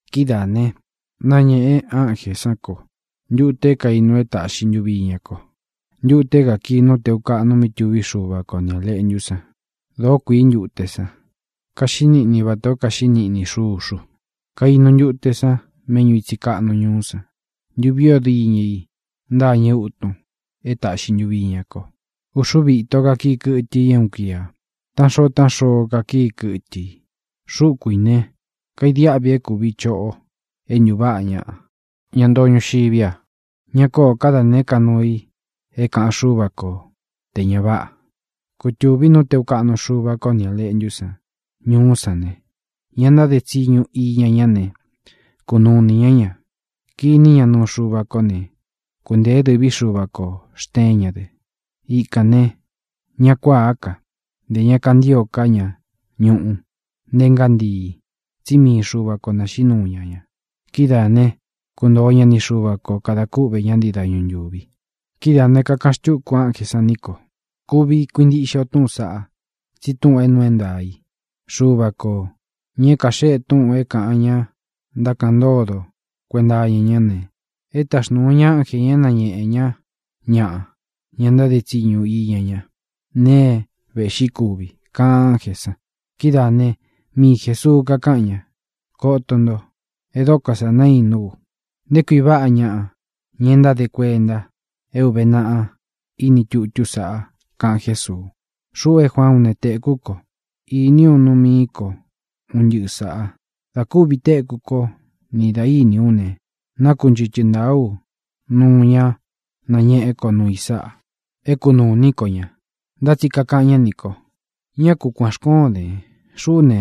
Kidáā ne, náñēꞌe ánjē sán ko ntute é kainu é tāꞌxi ntuvi iña ko, ntute é kākii nú tēu kaꞌnu mí tuví Xuva ko ni Ā Leꞌntú san. Dōó kuīí ntute san. Kaxiꞌí niꞌni vatā o kaxiꞌí niꞌni xuxu. Kainu ntute san méꞌñu ītsi kaꞌnu ñuú san. Ntuví o diñɨ i ntâñɨ útun e táꞌxi ntuvi iña ko. Uxuvi íto kakii kɨtɨ i é uun kuia. Taꞌán xoo taꞌán xoo kakíi kɨtɨ i. Xúku ī ne, kaidiáꞌvi é kūvi choꞌo é ntuváꞌa ñaꞌa, ña ntoo ñuxiví a. Ña kóō ká da nēé ka nuu i é kāꞌan Xúva ko tē ña váꞌa. Kutūví nú tēu kaꞌnu Xúva ko ni Ā Leꞌntú san ñuú san ne, ña ntáde tsiñu iña ñá ne, kunuu ini ñá ña. Kiní ña nuu Xuva kó ne, kuntēé dɨ̄ví Xuva kō xteén ña dɨ. Ikān ne, ñá kuāá ka, ntē ña kantío ká ña ñuꞌu, nté ngántii, tsí mii Xuva ko naxīꞌí nuu ña ña. Kidáā né, kuntoo ña ni Xuva ko, kadā kúꞌvē ñá ntii dañu ntūvi. Kidáā ne, kakaꞌan xtúku ánjē san ní ko: —Kuvi kuintiꞌxe o túꞌūn saꞌá, tsi túꞌūn é nuu é ntaā i. Xuva kō, ña é kaxéꞌe túꞌūn é kāꞌan ña ntákaꞌan ntódo kuenta iña ñá ne, e táxnūu ña ánje ñā é nañēꞌe ñá ñaꞌa, ña ntáde tsiñu iña ñá, nēe é vēꞌxí kuvi —kaꞌan ánjē san. Kidáā né, mii Jēsuu kakáꞌan ña: —¡Koto nto! ¡E dóko sā naínú u! ¡Nté kui váꞌa ñaꞌa, ña e ntáde kuenta é ūve naꞌa ini tutú sāꞌa! —kaꞌan Jésuu. Xuꞌu é Juaán u ne, tēkú ko ne, iní u nuu mií ko un ntɨꞌɨ sāꞌa. Dā kúvī téku kó, nī dá iní u ne, nákunchɨtɨ ntāa ú nuu ña nañéꞌe kó nuu i sáꞌa, é kunūu iní ko ña. Ntá tsi kakaꞌan ñá nī ko: —¡Ñá ku kuān xkóon dēn! Xuꞌú ne,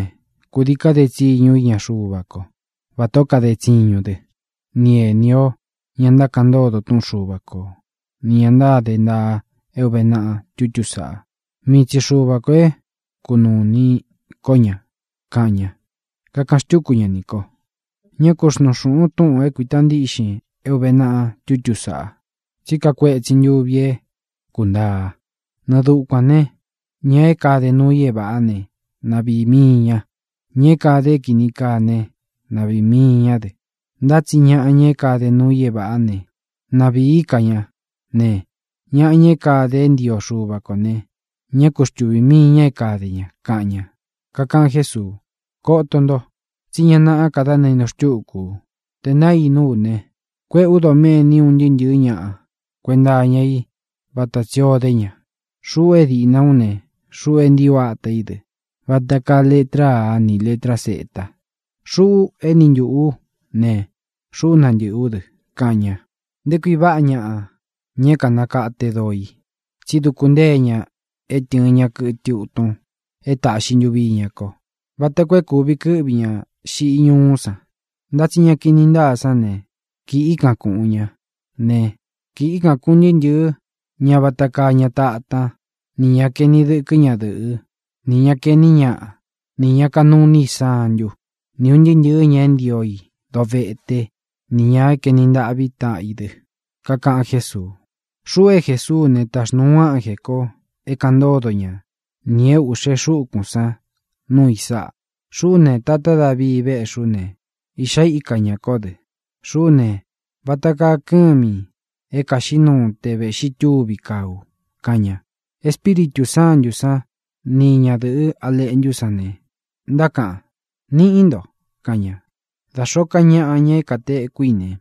kūdii kade tsiñu ú iña Xuva kó, vatā ó kade tsiñun dɨ, ni ēni ó, ña ntákaꞌan ntódo túꞌun Xuva ko, nī ña ntáde ntaa é ūve naꞌa tutú sāꞌa. Mii tsi Xuva kō é kunūu ini ko ña —kaꞌan ña. Kakaꞌan xtúku ña nī ko: —Ñá ku xnuun xūꞌun túꞌūn é kuīta ntíꞌxin é ūve naꞌa tutú sāꞌa, tsí kakuetsin ntuvi é kūntaa. Nɨɨ dukuān ne, ña é kāde nuu i é ña váꞌa ne, na vīi mii ña. Ña é kāde é kīni kaa né, na vīi mii ñá dɨ. Ntá tsi ñaꞌa, ña é kāde nuu i é vāꞌá ne, na vīí ka ña ne, ñaꞌa, ña é kāde é ntio Xuva ko ne, ñá ku xtuvī mii ña é kāde ña —kaꞌan ña. Kakaꞌan Jésuu: —Koto nto, tsí ña náꞌā ka dá nainu xtúku u. Tē nainú u ne, kuéꞌē ú doméni un ntɨɨ́ ntɨ̄ɨ́ ñaꞌa kuenta iña í vata tsī o dé ña. Xuꞌu é dīꞌna ú ne, xuꞌu é ntii u átā í dɨ, vata kaa letra Á ni lētrá Z. Xuꞌu éni ntūꞌu ú ne, xuꞌú nantɨ̄ꞌɨ ú dɨ —kaꞌan ña. Nté kui váꞌa ñaꞌa, ña é kānakate doo i, tsí duku ntée ña é tɨ̄ɨn ña kɨtɨ utun é tāꞌxi ntuvi iña ko, vata koo é kūvi kɨ́ꞌvi ña xiꞌi ñúú san. Ntá tsi ña kini ntáa sán ne, kíꞌi kan kūꞌun ñá ne, kíꞌi kan kūꞌun ntɨɨ́ ntɨɨ̄ ñá vata kaa ña tatán, nī ña kaeni dɨkɨ́ ñadɨ̄ꞌɨ́, nī ña kaeꞌní ñaꞌa, nī ña kanuu iní i santú, ni ūn ntɨɨ́ ntɨɨ̄ ña é ntio i doveté, nī ña kaeni ntaꞌví taꞌan i dɨ. Kakaꞌan Jésuu: —Xuꞌu é Jesuú u ne, taxnūu u ánjē ko é kāꞌan ntódo ña nī é ūꞌxe xúkūn sán nuu i sáꞌa. Xuꞌú ne, tatá Davii véꞌxi ú ne, iꞌxá ika ñā kó dɨ. Xuꞌú ne, vata kaa kɨ́mi é kāxiꞌí nuu te vēꞌxi túvi kaa u —kaꞌan ña. Espíritū Sántū sán ni ñadɨ̄ꞌɨ́ A Leꞌntú san ne, ntákaꞌan: —¡Niꞌí nto! —kaꞌan ña. Da xōó ka ñaꞌa, ña é kātekú i ne,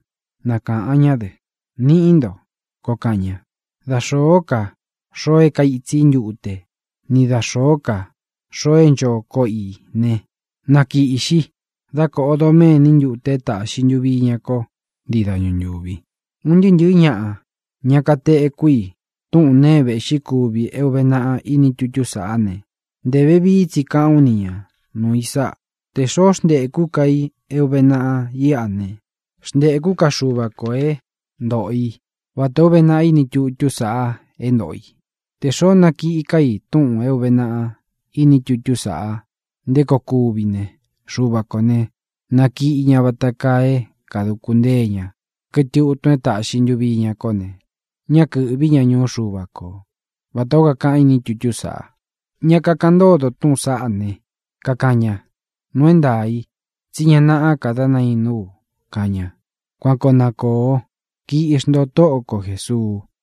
na kāꞌan ñá dɨ: —¡Niꞌí nto! —koo kaꞌan ña. Da xōó ka xoo é kaitsi í ntute, ni da xōó ka xoo é ncho koꞌo i ne, na kīꞌxi, dá kōꞌo doméni ntute é tāꞌxi ntuvi iña ko ntii dañu ntúvi. Un ntɨɨ́ ntɨ̄ɨ́ ñaꞌa, ña kateku i túꞌun nēe é vēꞌxí kuvi é ūve naꞌa ini tutú sāꞌá ne, ntē vevií tsi káꞌān ú ni ña nuū i sáꞌa: Tē xoó xntēkú ka i é ūve naꞌa íꞌa ne, xntēkú ka Xuva kō é ntoꞌo i vatā ó uve naꞌa ini tutú sāꞌa é ntōꞌo i. Tē xoó nakiꞌi ká i túꞌūn é ūve naꞌa ini tutú sāꞌa nté koo kuvi ne, Xuva kō ne, nakiꞌi ña vata kaa é kāduku ntée ña kɨtɨ utun é tāꞌxi ntuvi iña kó ne, ñá kɨ̄ꞌví ña ñuú Xuva ko, vatā ó kakaꞌan ini tutú sāꞌa. Ña kakaꞌan ntódo túꞌūn saꞌá ne, kakaꞌan ña: —Nuu é ntaā í, tsí ña naꞌá ka dá nainú u —kaꞌan ña. Kuan koo na kōo. ¡Kiꞌxi nto, Tóꞌo ko Jēsuu!